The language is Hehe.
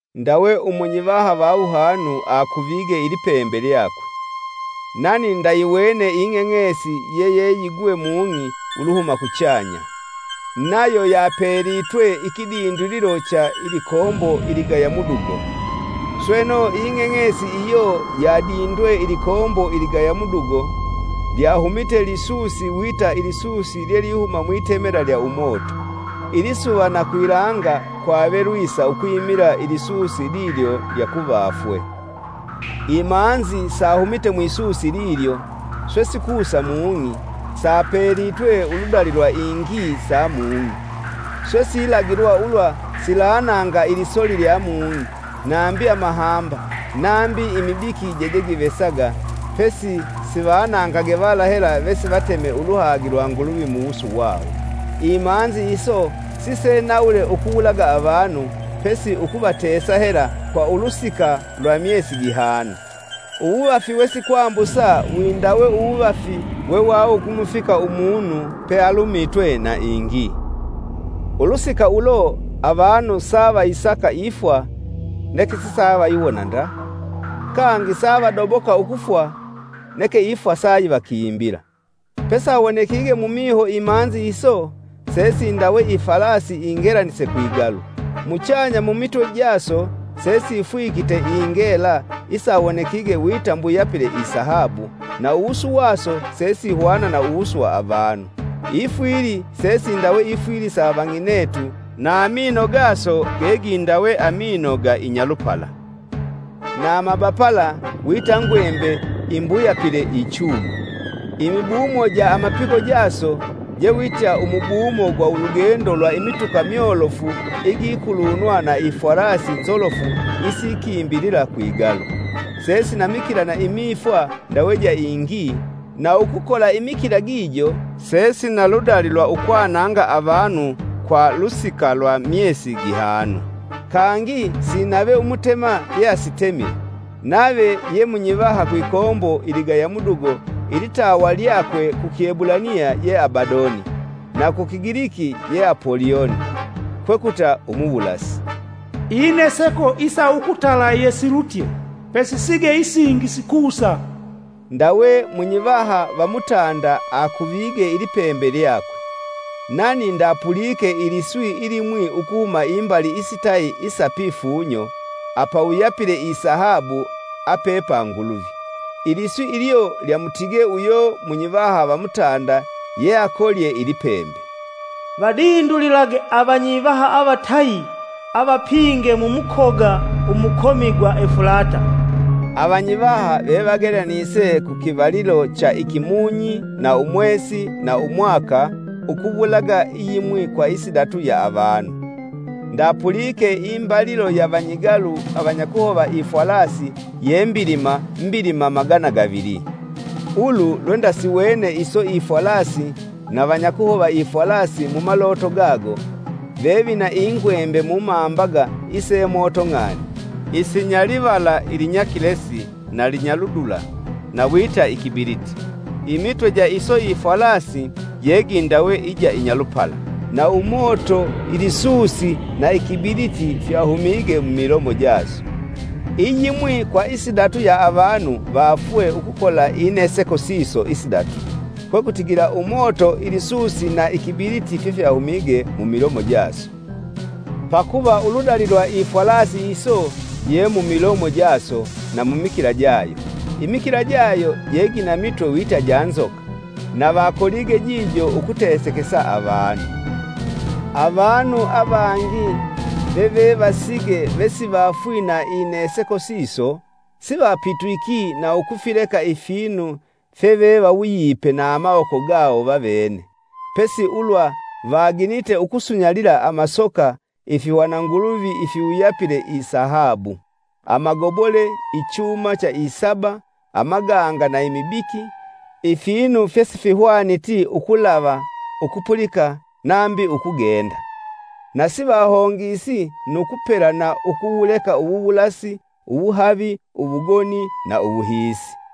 Ndawe umunyivaha va wuhanu akuvige ilipembe lyakwe. Nani ndayiwene ing'eng'esi yeyeyigwe mung'i uluhuma kuchanya. Nayo yapelitwe ikidindulilo cha ilikombo iligaya mudugo. Sweno, ing'eng'esi iyo yadindwe ilikombo iligaya mudugo, lyahumite lisusi wita ilisusi lyelihuma mwitemela lya umoto. Ilisuva na kwilanga kwave lwisa ukwimila ilisusi lilyo lya kuvafwe. Imanzi sahumite mwisusi lilyo, swe sikusa mung'i, sapelitwe uludali lwa ingii sa mung'i. Swe silagilwa ulwa silananga ilisoli lya mung'i nambi amahamba nambi imibiki jejegivesaga, pesi sivanangage vala hela vesivateme uluhagi lwa Nguluvi muwusu wawo. Imanzi iso sisenawule ukuwulaga avanu, pesi ukuvatesa hela kwa ulusika lwa myesi gihanu. Uwuvafi wesikwambusa windawe uwuvafi wevakumufika umunu pealumitwe na ingii. Ulusika ulo avanu savayisaka ifwa neke sisavayiwona nda; kangi savadoboka ukufwa neke ifwa sayivakimbila. Pesawonekige mumiho imanzi iso, sesindawe ifwalasi ingelanise kwigalu. Muchanya mumitwe jaso sesifwikitwe ingela isawonekige wita mbuyapile isahabu, na uwusu waso sesihwana na uwusu wa avanu. Ifwili sesindawe ifwili sa avang'inetu, na amino gaso gegindawe amino ga Inyalupala. Na amabapala wita ngwembe imbuyapile ichuma. Imibumo ja amapiko jaso je wita umubumo gwa ulugendo lwa imituka myolofu igikulunwa na ifwalasi nzolofu isikimbilila kwigalu. Sesina mikila na imifwa ndawe ja ingii, na ukukola imikila gijo sesina ludali lwa ukwananga avanu kwa lusika lwa myesi gihanu. Kangi sinave umutema yeasitemile, nave ye munyivaha kwikombo iligaya mudugo ilitawa lyakwe ku kiebulaniya ye Abadoni, na ku Kigiliki ye Apolioni, kwekuta Umuwulasi. Ineseko isa ukutala yesilutye; pesisige isingi sikusa. Ndawe munyivaha va mutanda akuvige ilipembe lyakwe. Nani ndapulike iliswi ilimwi ukuhuma imbali isitayi isa pifunyo apawuyapile isahabu ape pa Nguluvi. Iliswi ilyo lyamutige uyo munyivaha va mutanda yeakolye ilipembe, “Vadindulige avanyivaha avatayi avapinge mu mukoga umukomi gwa Efulata!” Avanyivaha vevagelanise ku kivalilo, ikimunyi umwesi, ukuwulaga iyimwi kwa isidatu ya avanu. Ndapulike imbalilo ya vanyigalu avanyakuhova ifwalasi ye mbilima, mbilima magana gavili. Ulu lwendasiwene iso ifwalasi na vanyakuhova ifwalasi mu maloto gago: vevina ingwembe mumambaga ise moto ng'ani, isinya livala ilinyakilesi na linyaludula na wita ikibiliti. Imitwe ja iso ifwalasi jegindawe ija inyalupala; na umoto ilisusi na ikibiliti fyahumige mumilomo jaso. Iyimwi kwa isidatu ya avanu vaafwe ukukola ineseko siso isidatu, kwekutigila, umoto, ilisusi na ikibiliti, fyefyahumige mumilomo jaso; pakuva uludali lwa ifwalasi iso je mumilomo jaso na mumikila jayo. Imikila jayo jegina mitwe wita ja nzoka, na vakolige jijo ukutesekesa avanu. Avanu avangi vevevasige vesivafwii na ineseko siso, sivapitwiki na ukufileka ifinu fyevevawuyipe na amawoko gawo vavene, pesi ulwa vaginite ukusunyalila amasoka, ifihwana nguluvi ifiwuyapile isahabu, amagobole, ichuma cha isaba, amaganga na imibiki, ifinu fyesihwaniti ukulava, ukupulika nambi ukugenda. Na sivahongesi nu kupela na ukuwuleka uwuwulasi, uwuhavi, uwugoni na uwuhiisi.